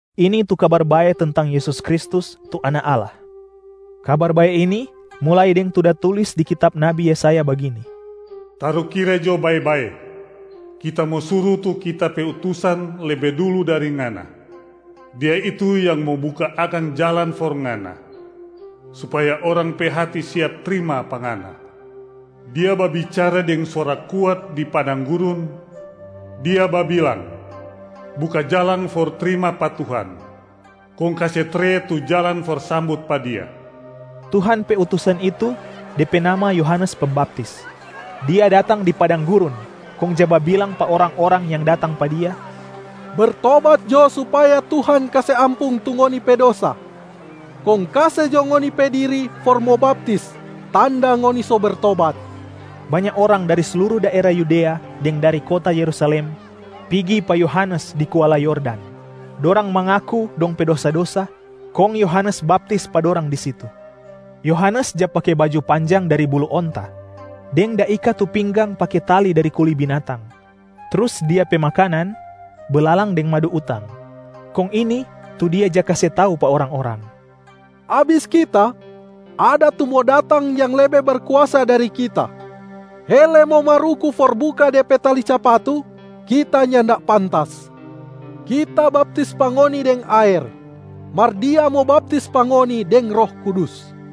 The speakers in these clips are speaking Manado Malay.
Ini tu Kabar Bae tentang Yesus Kristus, tu Anak Allah. Kabar Bae ini mulai deng tu da tulis di kitab nabi Yesaya bagini, “Tarukira jo bae-bae, Kita mo suru tu Kita pe utusan lebe dulu dari Ngana. Dia itu yang mo buka akang jalang for Ngana, supaya orang pe hati siap trima pa Ngana. Dia babicara deng suara kuat di padang gurun, dia babilang, ‘Buka jalang for trima pa Tuhan, kong kase tre tu jalang for sambut pa Dia.’” Tuhan pe utusan itu, de pe nama Yohanes Pembaptis. Dia datang di padang gurun kong ja babilang pa orang-orang yang datang pa dia, “Bertobat jo supaya Tuhan kase ampung tu ngoni pe dosa, kong kase jo ngoni pe diri for mo baptis, tanda ngoni so bertobat.” Banya orang dari sluru daera Yudea deng dari kota Yerusalem pigi pa Yohanes di kuala Yordan. Dorang mangaku dong pe dosa-dosa, kong Yohanes baptis pa dorang di situ. Yohanes ja pake baju panjang dari bulu onta deng da ika tu pinggang pake tali dari kuli binatang, trus dia pe makanan belalang deng madu utang. Kong ini tu dia ja kase tau pa orang-orang, “Abis kita, ada tu mo datang yang lebe berkuasa dari kita. Hele mo maruku for buka Dia pe tali capatu, kita nyanda pantas. Kita baptis pa ngoni deng aer, mar Dia mo baptis pa ngoni deng Roh Kudus.”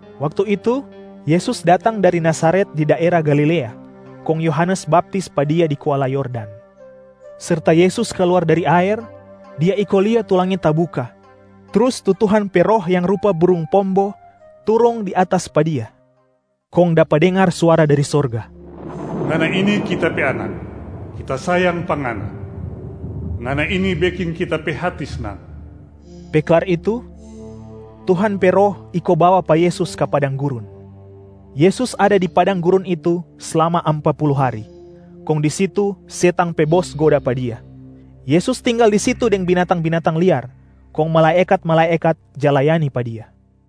Waktu itu, Yesus datang dari Nazaret di daera Galilea, kong Yohanes baptis pa Dia di kuala Yordan. Serta Yesus kaluar dari aer, Dia iko lia tu langit tabuka, trus tu Tuhan pe Roh yang rupa burung pombo turung di atas pa Dia. Kong dapa dengar suara dari sorga, “Ngana ini Kita pe Anak, Kita sayang pa Ngana. Ngana ini beking Kita pe hati snang.” Pe klar itu, Tuhan pe Roh iko bawa pa Yesus ka padang gurun. Yesus ada di padang gurun itu slama ampa pulu hari, kong di situ setang pe bos goda pa Dia. Yesus tinggal di situ deng binatang-binatang liar, kong malaekat-malaekat ja layani pa Dia.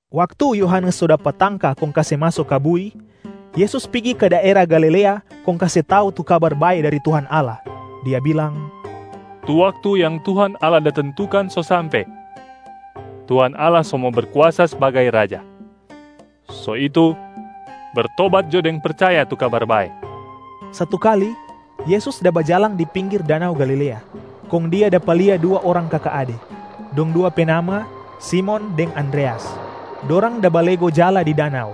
Waktu Yohanes so dapa tangka kong kase maso ka bui, Yesus pigi ka daera Galilea kong kase tau tu Kabar Bae dari Tuhan Allah. Dia bilang, “Tu waktu yang Tuhan Allah da tentukan so sampe, Tuhan Allah so mo Berkuasa sbagai Raja. So itu, bertobat jo deng percaya tu Kabar Bae.” Satu kali Yesus da bajalang di pinggir danau Galilea, kong Dia dapa lia dua orang kaka ade, dong dua pe nama Simon deng Andreas. Dorang da balego jala di danau,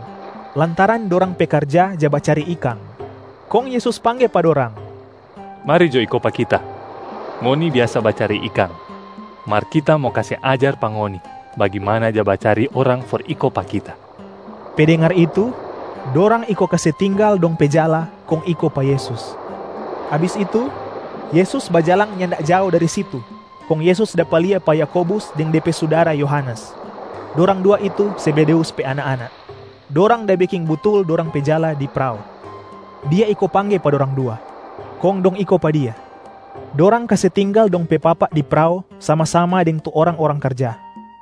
lantaran dorang pe karja ja bacari ikang. Kong Yesus pangge pa dorang, “Mari jo iko pa Kita! Ngoni biasa bacari ikang, mar Kita mo kase ajar pa ngoni bagimana ja bacari orang for iko pa Kita.” Pe dengar itu, dorang iko kase tinggal dong pe jala kong iko pa Yesus. Abis itu, Yesus bajalang nyanda jao dari situ kong Yesus dapa lia pa Yakobus deng de pe sudara Yohanes, dorang dua itu Zebedeus pe anak-anak. Dorang da beking butul dorang pe jala di prao. Dia iko pangge pa dorang dua, kong dong iko pa Dia. Dorang kase tinggal dong pe papa di prao sama-sama deng tu orang-orang karja.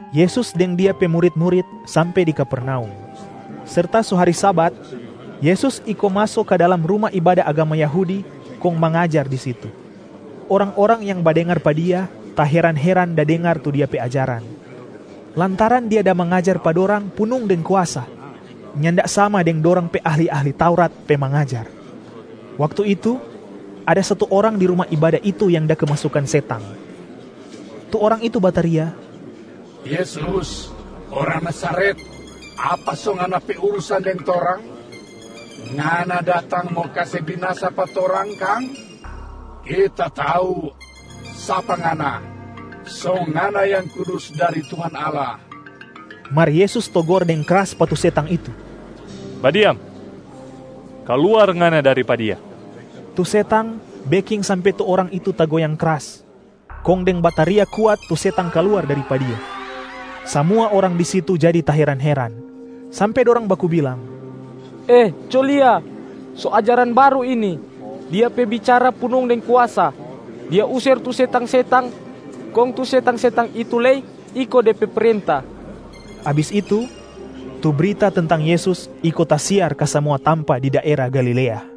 Yesus deng Dia pe murit-murit sampe di Kapernaum. Serta so hari Sabat, Yesus iko maso ka dalam ruma ibada agama Yahudi kong mangajar di situ. Orang-orang yang badengar pa Dia taheran-heran da dengar tu Dia pe ajaran, lantaran Dia da mangajar pa dorang punung deng kuasa, nyanda sama deng dorang pe ahli-ahli Taurat pe mangajar. Waktu itu, ada satu orang di ruma ibada itu yang da kemasukan setang. Tu orang itu bataria, “Yesus, orang Nazaret! Apa so Ngana pe urusan deng torang? Ngana datang mo kase binasa pa torang kang? Kita tau sapa Ngana, so Ngana Yang Kudus dari Tuhan Allah.” Mar Yesus togor deng kras pa tu setang itu, “Badiam, kaluar ngana dari pa dia!” Tu setang beking sampe tu orang itu tagoyang kras, kong deng bataria kuat tu setang kaluar dari pa dia. Samua orang di situ jadi taheran-heran, sampe dorang baku bilang, “Eh, co lia! So ajaran baru ini! Dia pe bicara punung deng kuasa. Dia user tu setang-setang kong tu setang-setang itu lei iko De pe prenta.” Abis itu, tu brita tentang Yesus iko tasiar ka samua tampa di daera Galilea.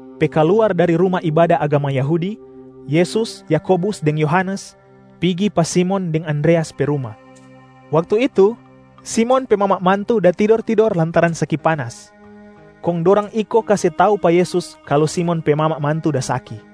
Pe kaluar dari ruma ibada agama Yahudi, Yesus, Yakobus deng Yohanes pigi pa Simon deng Andreas pe ruma. Waktu itu Simon pe mama mantu da tidor-tidor lantaran saki panas, kong dorang iko kase tau pa Yesus kalu Simon pe mama mantu da saki.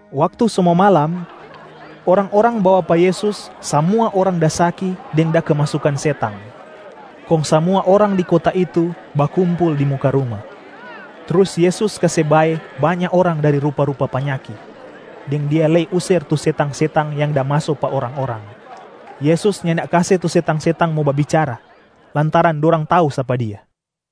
Waktu so mo malam, orang-orang bawa pa Yesus samua orang da saki deng da kemasukan setang. Kong samua orang di kota itu bakumpul di muka ruma. Trus Yesus kase bae banya orang dari rupa-rupa panyaki, deng Dia lei user tu setang-setang yang da maso pa orang-orang. Yesus nyanda kase tu setang-setang mo babicara, lantaran dorang tau sapa Dia.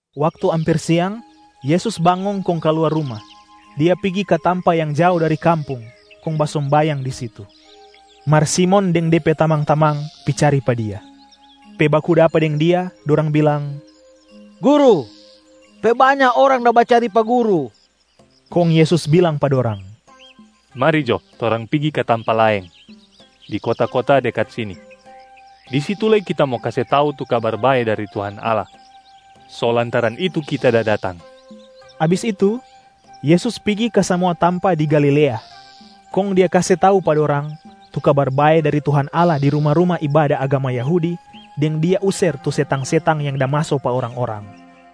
Waktu amper siang, Yesus bangong kong kaluar ruma. Dia pigi ka tampa yang jao dari kampung kong basombayang di situ. Mar Simon deng de pe tamang-tamang pi cari pa Dia. Pe baku dapa deng Dia, dorang bilang, “Guru, pe banya orang da bacari pa Guru.” Kong Yesus bilang pa dorang, “Mari jo, torang pigi ka tampa laeng, di kota-kota dekat sini. Di situ lei Kita mo kase tau tu Kabar Bae dari Tuhan Allah, so lantaran itu Kita da datang.” Abis itu Yesus pigi ka samua tampa di Galilea, kong Dia kase tau pa dorang tu Kabar Bae dari Tuhan Allah di ruma-ruma ibada agama Yahudi deng Dia user tu setang-setang yang da maso pa orang-orang.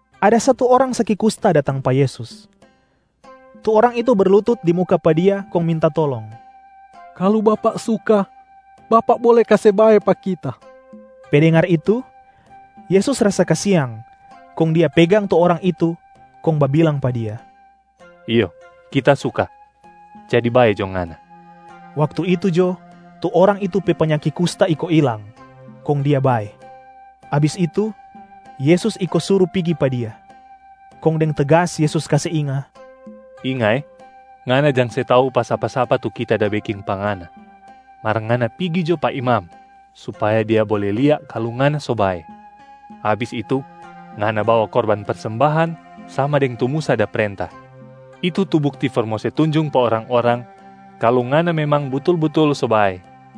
Ada satu orang saki kusta datang pa Yesus. Tu orang itu berlutut di muka pa Dia kong minta tolong, “Kalu Bapak suka, Bapak bole kase bae pa kita.” Pe dengar itu, Yesus rasa kasiang, kong Dia pegang tu orang itu kong babilang pa dia, “Iyo Kita suka, jadi bae jo ngana!” Waktu itu jo, tu orang itu pe panyaki kusta iko ilang, kong dia bae. Abis itu Yesus iko suru pigi pa dia, kong deng tegas Yesus kase inga, “Inga eh! Ngana jang se tau pa sapa-sapa tu Kita da beking pa ngana. Mar ngana pigi jo pa imam supaya dia bole lia kalu ngana so bae. Abis itu, ngana bawa korban persembahan sama deng tu Musa da prenta, itu tu bukti for mo se tunjung pa orang-orang kalu ngana memang butul-butul so bae.”